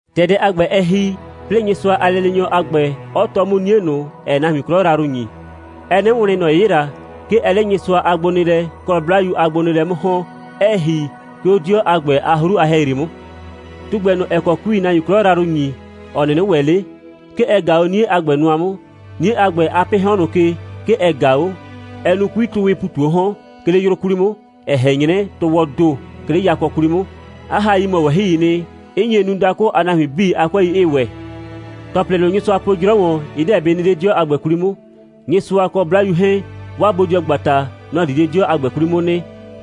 ‑Tɛ dɛ a ‑gbɛ, ɛ ‑hi, 'plɩɩ Nyɩsʋa a lɛleenyɔ a ‑gbɛ, 'ɔ tɔɔ 'mʋ 'nie ꞊nʋ, ‑ɛɛ nahuin 'klɔ yrayrʋ ‑nyi. Ɛɛ 'nɩ wlɩn, ‑nɔ 'yɩla. 'Ke ɛɛ 'le Nyɩsʋa a gbonɩɩlɛ kɔ 'Blayu a gbonɩɩlɛ 'mʋ ‑hɔn, 'ɛɛ ‑hi, 'ke 'o 'dɩɔ a ‑gbɛ a 'hru a ‑hɛyri 'mʋ. Tugbɛ ꞊nʋ, ‑ɛ kɔ 'kuii nahuin 'klɔ yrayrʋ ‑nyi, ‑ɔ 'nɩnɩ ‑wɛ 'le, 'ke ɛ ꞊gaa 'o 'nie a ‑gbɛ nʋa 'mʋ. 'Nie a ‑gbɛ a 'pɩɩ 'hɔn ꞊nʋ ke, 'ke ɛ ꞊gaa 'o. Ɛɛ nu 'kuitʋʋwɩɩ ‑pu ꞊tu 'o 'hɔn, 'ke 'le 'yrʋ 'kwli 'mʋ, ‑ɛ ꞊hɛn 'nyrɛ tʋʋwɔɔ ‑do, 'ke 'le yakɔ 'kwli 'mʋ. 'A hai mɔ ꞊wɛhɩɩ nɩ, 'ɩ nye nu, dakʋ a nahuin 'bii a 'kʋɛi 'ɩɩ ‑wɛ. ‑Tɔplɩ ꞊nʋ, Nyɩsʋa po 'jrɔ ‑wɔn, ɩ 'deɛ bɩ nɩ 'le 'dɩɔ a ‑gbɛ 'kwli 'mʋ. Nyɩsʋa kɔ 'Blayu 'hɛɛn, 'waa bodɩɔgbata, nɔ‑ di 'le 'dɩɔ a ‑gbɛ 'kwli 'mʋ nɩ,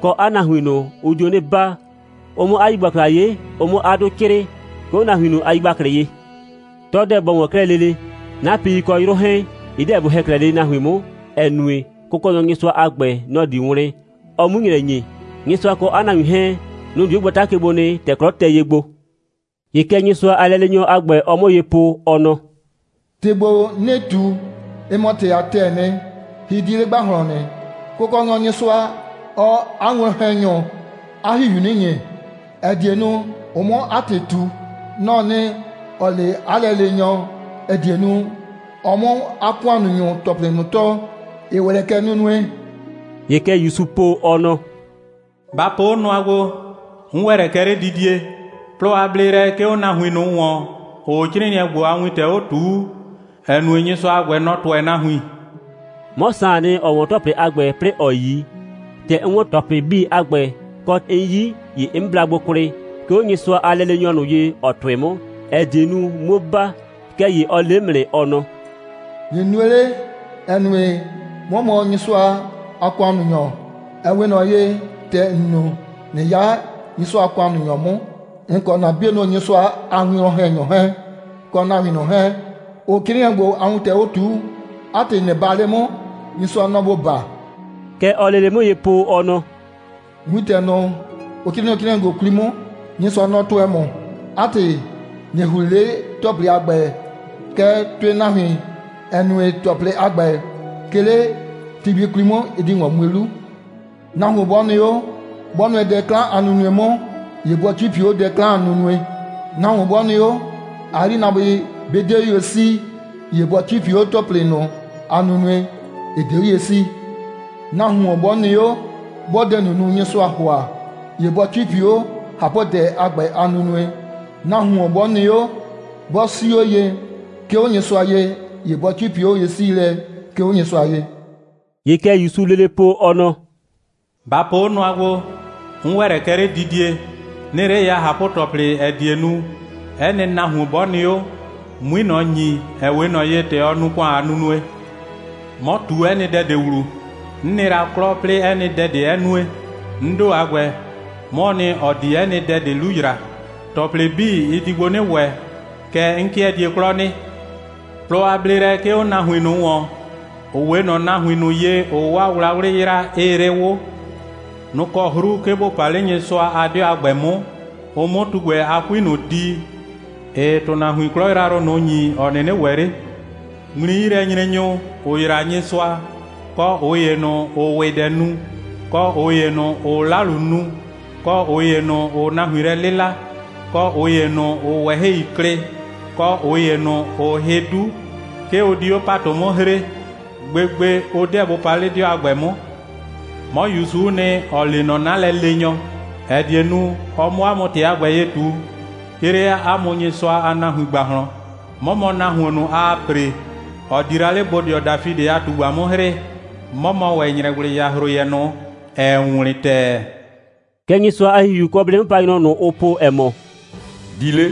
kɔ, 'a nahuin ꞊nʋ, ʋ dio 'nɩ baa, ʋ 'mʋ 'a yigbakla 'ye, ʋ 'mʋ 'a 'dʋ 'crɩɩ, 'ke 'o 'a nahuin ꞊nʋ a yigbaklɩ ye. 'Tɔ 'deɛ bɔ ‑wɔn 'klɛɛ lele. 'Napɩi kɔ 'yrʋ 'hɛɛn, ɩ 'deɛ bɩ ‑hɛ 'klɛɛ lele nahuin 'mʋ, ‑ɛ nue, Kʋkɔnyɔ Nyɩsʋa a ‑gbɛ, nɔ‑ di wlɩn, ɔ 'mu ‑nyrɛ ‑nye. Nyɩsʋa kɔ 'a nahuin 'hɛɛn, nʋ‑ di 'o gbata ke gbo nɩ, ‑tɛ 'klɔ tɛ ye gbo. ‑Ye kɛ Nyɩsʋa a lɛleenyɔ a ‑gbɛ, ɔɔ 'mʋ ye po, ɔ nɔ: «‑Tɩ ‑gbo, 'nɩɩ ꞊tu, ɩ mɔ ‑tɩ a ‑tɛɛ nɩ, hɩ 'di 'le ‑gbahlɔn nɩ. Kʋkɔnyɔ Nyɩsʋa, ɔɔ 'a winwlɔn‑hɛnyʋ 'a ‑Hihiu 'nɩ ‑nye, ‑ɛ die nu, ʋ 'mʋ 'a ‑tɩ ꞊tu. Nɔ‑ɔ nɩ, ‑ɔ le 'a lɛleenyɔ, ‑ɛ die nu, ɔ 'mʋ 'a ‑kʋannunyʋ ‑tɔplɩ ꞊nʋ tɔɔ, ‑ɩ ‑wɛ lɛ kɛ nunue.» ‑Ye kɛ ‑Yusuu po, ɔ nɔ: «Ba po 'o nʋa gbo. 'N ‑wɛ lɛ kɛ 'ledidie. Plɔ a bleelɛ 'ke 'o nahuin ꞊nʋ ‑wɔn, ‑ʋʋ 'crɩɩnɩɛ ‑gbo a wintɛ 'o ꞊tuu, ‑ɛ nue, Nyɩsʋa a ‑gbɛ, nɔ‑ tʋɛ nahuin.» 'Mɔ Saan nɩ, ‑ɔ 'wɔn ‑tɔplɩ a ‑gbɛ, 'plɩɩ ‑ɔ 'yi. ‑Tɛ 'n 'wɔn ‑tɔplɩ 'bii a ‑gbɛ, kɔ, 'n 'yi, ‑ye 'n bla gbo kwlɩ, 'ke 'o Nyɩsʋa a lɛleenyɔ ꞊nʋ ye, ‑ɔ tʋɩ 'mʋ, ‑ɛ die nu, 'muo baa. Kɛɛ ‑ye ɔ le 'mʋ nɩ, ɔ nɔ: «꞊Nɩ nue 'le, ‑ɛ nue, 'mɔ mɔ Nyɩsʋa a ‑kʋannunyɔ, ‑ɛ 'we ꞊nɔ ye, ‑tɛ ‑n nu, ꞊nɩ 'ya Nyɩsʋa a ‑kʋannunyɔ 'mʋ, ‑n kɔ ‑na 'bienʋ Nyɩsʋa a winwlɔn‑hɛnyʋ 'hɛɛn, kɔ nahuin ꞊nʋ 'hɛɛn, ‑ʋʋ 'crɩɩnɩɛ ‑gbo a wintɛ 'o ꞊tuu. 'A ‑tɩ, ꞊nɩ baa 'le 'mʋ. Nyɩsʋa, nɔ‑ ‑bo baa.» Kɛ ɔɔ lele 'mʋ ye po, ɔ nɔ: «Wintɛ ꞊nʋ, ‑n 'crɩɩ nɔ 'crɩɩnɩɛ ‑gbo 'kwli 'mʋ, Nyɩsʋa, nɔ‑ tʋɛ ‑mʋ. 'A ‑tɩ, ꞊nɩ ‑hli 'le ‑tɔplɩ a ‑gbɛ, kɛɛ, tʋɩ nahuin, ‑ɛ nue, ‑tɔplɩ a ‑gbɛ, 'ke 'le ti gbi 'kwli 'mʋ, ɩ di ‑wɔn mue 'lu. Nahuon 'bɔ nɩ 'o, 'bɔ nʋɛ dɛ 'klan a nunue 'mʋ, ‑ye bɔ 'cipi 'o dɛ 'klan a nunue. Nahuon 'bɔ nɩ 'o, 'a 'yrinaabʋɩ 'bɩ 'de 'o ye 'sii, ‑ye bɔ 'cipi 'o ‑tɔplɩ ꞊nʋ a nunue, ‑ɩ 'de 'o ye 'sii. Nahuon 'bɔ nɩ 'o, 'bɔɔ dɛ ꞊nʋ nu, Nyɩsʋaa ‑hʋa, ‑ye bɔ 'cipi 'o ꞊hapʋdɛ a ‑gbɛ a nunue. Nahuon 'bɔ nɩ 'o, 'bɔ 'sii 'o ye, 'ke 'o Nyɩsʋa ye, ‑ye bɔ 'cipi 'o ye'siilɛ, 'ke 'o Nyɩsʋa ye.» ‑Ye kɛ ‑Yusuu lele po, ɔ nɔ: «Ba po 'o nʋa gbo, 'n ‑wɛ lɛ kɛ 'ledidie. 'Nɩɩ 'le ya ꞊hapʋ‑tɔplɩ, ‑ɛ die nu, 'ɛ nɩ nahuon, 'bɔ nɩ 'o, 'mui ꞊nɔ ‑nyi, ‑ɛ 'we ꞊nɔ ye, ‑tɛ ɔ nu ‑kʋan a nunue. 'Mɔ ꞊tu 'ɛ nɩ dɛ ꞊de ‑wlu. 'N nɩ la 'klɔ, 'plɩɩ 'ɛ nɩ dɛ ꞊de 'ɛ nue. 'N ‑do a ‑gbɛ, 'mɔɔ nɩ, ‑ɔ di 'ɛ nɩ dɛ ꞊de 'lu ‑yra. ‑Tɔplɩ 'bii, ɩ di gbo 'nɩ ‑wɛ, kɛɛ, 'n 'kɩɛ die 'klɔ nɩ. Plɔ a bleelɛ 'ke 'o nahuin ꞊nʋ ‑wɔn, ‑ʋ 'we ꞊nɔ nahuin ꞊nʋ ye, ‑ʋʋ 'waa wlawlɩ yra, 'ɩɩ 'le 'wʋ. Nʋ‑ kɔ 'hru, 'ke ‑bʋ pa 'le Nyɩsʋa a 'dɩɔ a ‑gbɛ 'mʋ, ʋ 'mʋ tugbɛ a 'kui ꞊nʋ di, ‑ɩɩ ‑tʋnahuin 'klɔ yrayrʋ ꞊nʋ ‑nyi, ‑ɔ 'nɩnɩ ‑wɛ 'le. Ŋmli'yilɛnyrenyʋ, ‑ʋ yraa Nyɩsʋa, kɔ ꞊ʋ ‑ye ꞊nʋ, ‑ʋʋ ‑wɩdɛ nu, kɔ ꞊ʋ ‑ye ꞊nʋ, ‑ʋʋ 'lalu nu, kɔ ꞊ʋ ‑ye ꞊nʋ, ‑ʋʋ nahuin lɛ 'lɩla, kɔ ꞊ʋ ‑ye ꞊nʋ, ‑ʋʋ ꞊wɛhɩi klɩ, kɔ ꞊ʋ ‑ye ꞊nʋ, ‑ʋʋ hɩ 'du, 'ke ʋ di 'o ‑patʋ 'mʋ hree. Gbegbe, ʋ 'deɛ bʋ pa 'le 'dɩɔ a ‑gbɛ 'mʋ. 'Mɔ ‑Yusu'u nɩ, ‑ɔ lee nɔ 'na lɛleenyɔ, ‑ɛ die nu, ɔ 'mʋ 'a mʋ ‑tɩ a ‑gbɛ ye ꞊tu, 'ke 'le 'a mʋ Nyɩsʋa a nahuin ‑gbahlɔn. 'Mɔ mɔ nahuon ꞊nʋ, aa ‑pre, ‑ɔ di la 'le bodɩɔ Dafidɩ a ꞊tugba 'mʋ 'hrɩɩ. 'Mɔ mɔ ‑wɛ ‑nyrɛgblɩyahroyɛ ꞊nʋ, ‑ɛɛ wlɩn ‑tɛɛ.» Kɛ Nyɩsʋa a ‑Hihiu, kɔ 'blɩ'mʋpanyrɔ ꞊nʋ, ʋʋ po, ‑ɛ mɔ: «Di 'le!»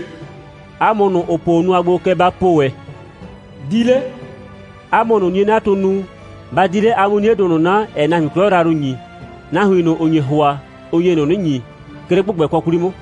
'A mʋ ꞊nʋ, ‑ʋ po 'o nʋa gbo, kɛ ba po ‑wɛ: «Di 'le!» 'A mʋ ꞊nʋ, 'nie'natʋʋ nu, ba di 'le, a 'mʋ 'niedʋ ꞊nʋ 'na, ‑ɛɛ nahuin 'klɔ yrayrʋ ‑nyi. Nahuin ꞊nʋ, ‑ʋ nye ‑hʋa, ʋ nye ꞊nʋ 'nɩ ‑nyi, 'ke 'le ‑gbʋgbɛkɔ 'kwli 'mʋ.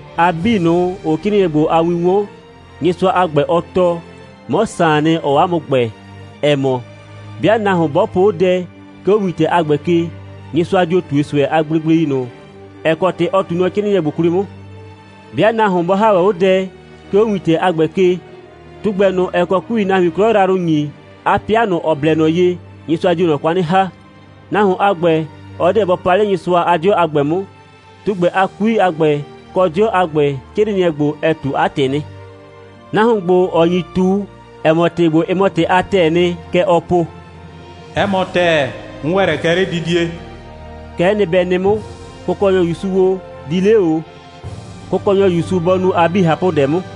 A 'bii ꞊nʋ, ‑ʋʋ 'crɩɩnɩɛ ‑gbo a win 'wɔn, Nyɩsʋa a ‑gbɛ, ɔ tɔɔ, 'mɔ Saan nɩ, ‑ɔɔ 'a mʋ ‑gbɛɛ, ‑ɛ mɔ: 'bɩa nahuon 'bɔ po 'o dɛ, 'ke 'o wintɛ a ‑gbɛ ke, Nyɩsʋa dio ꞊tue ꞊sʋɛ a gblegblei ꞊nʋ, ‑ɛ kɔ ‑tɩ ɔ ꞊tuu nɔ 'crɩɩnɩɛ ‑gbo 'kwli 'mʋ. 'Bɩa nahuon 'bɔ ‑ha ‑wɛ 'o dɛ, 'ke 'o wintɛ a ‑gbɛ ke, tugbɛ ꞊nʋ, ‑ɛ kɔ 'kuii nahuin 'klɔ yrayrʋ ‑nyi, 'a 'pɩa ꞊nʋ, ‑ɔ blɛ ꞊nɔ ye, Nyɩsʋa dio ꞊nɔ kwa 'nɩ ‑ha. Nahuon a ‑gbɛ, ɔ 'deɛ bɔ pa 'le Nyɩsʋa a 'dɩɔ a ‑gbɛ 'mʋ. Tugbɛ a 'kui a ‑gbɛ, kɔ 'dɩɔ a ‑gbɛ, 'crɩɩnɩɛ ‑gbo, ɛ ꞊tu 'a ‑tɩ nɩ. Nahuon ‑gbo, ‑ɔ nyi ꞊tu, ‑ɛ mɔ, ‑tɩ ‑gbo, ɩ mɔ ‑tɩ a ‑tɛɛ nɩ, kɛ ɔɔ po: «'Ɛ mɔ ‑tɛɛ, 'n ‑wɛ lɛ kɛ 'ledidie.» Kɛ'ɛ nɩ, bɛ nɩ 'mʋ! Kʋkɔnyɔ ‑Yusu o, di 'le ‑o! Kʋkɔnyɔ ‑Yusu bɔ nu a 'bii ꞊hapʋdɛ 'mʋ.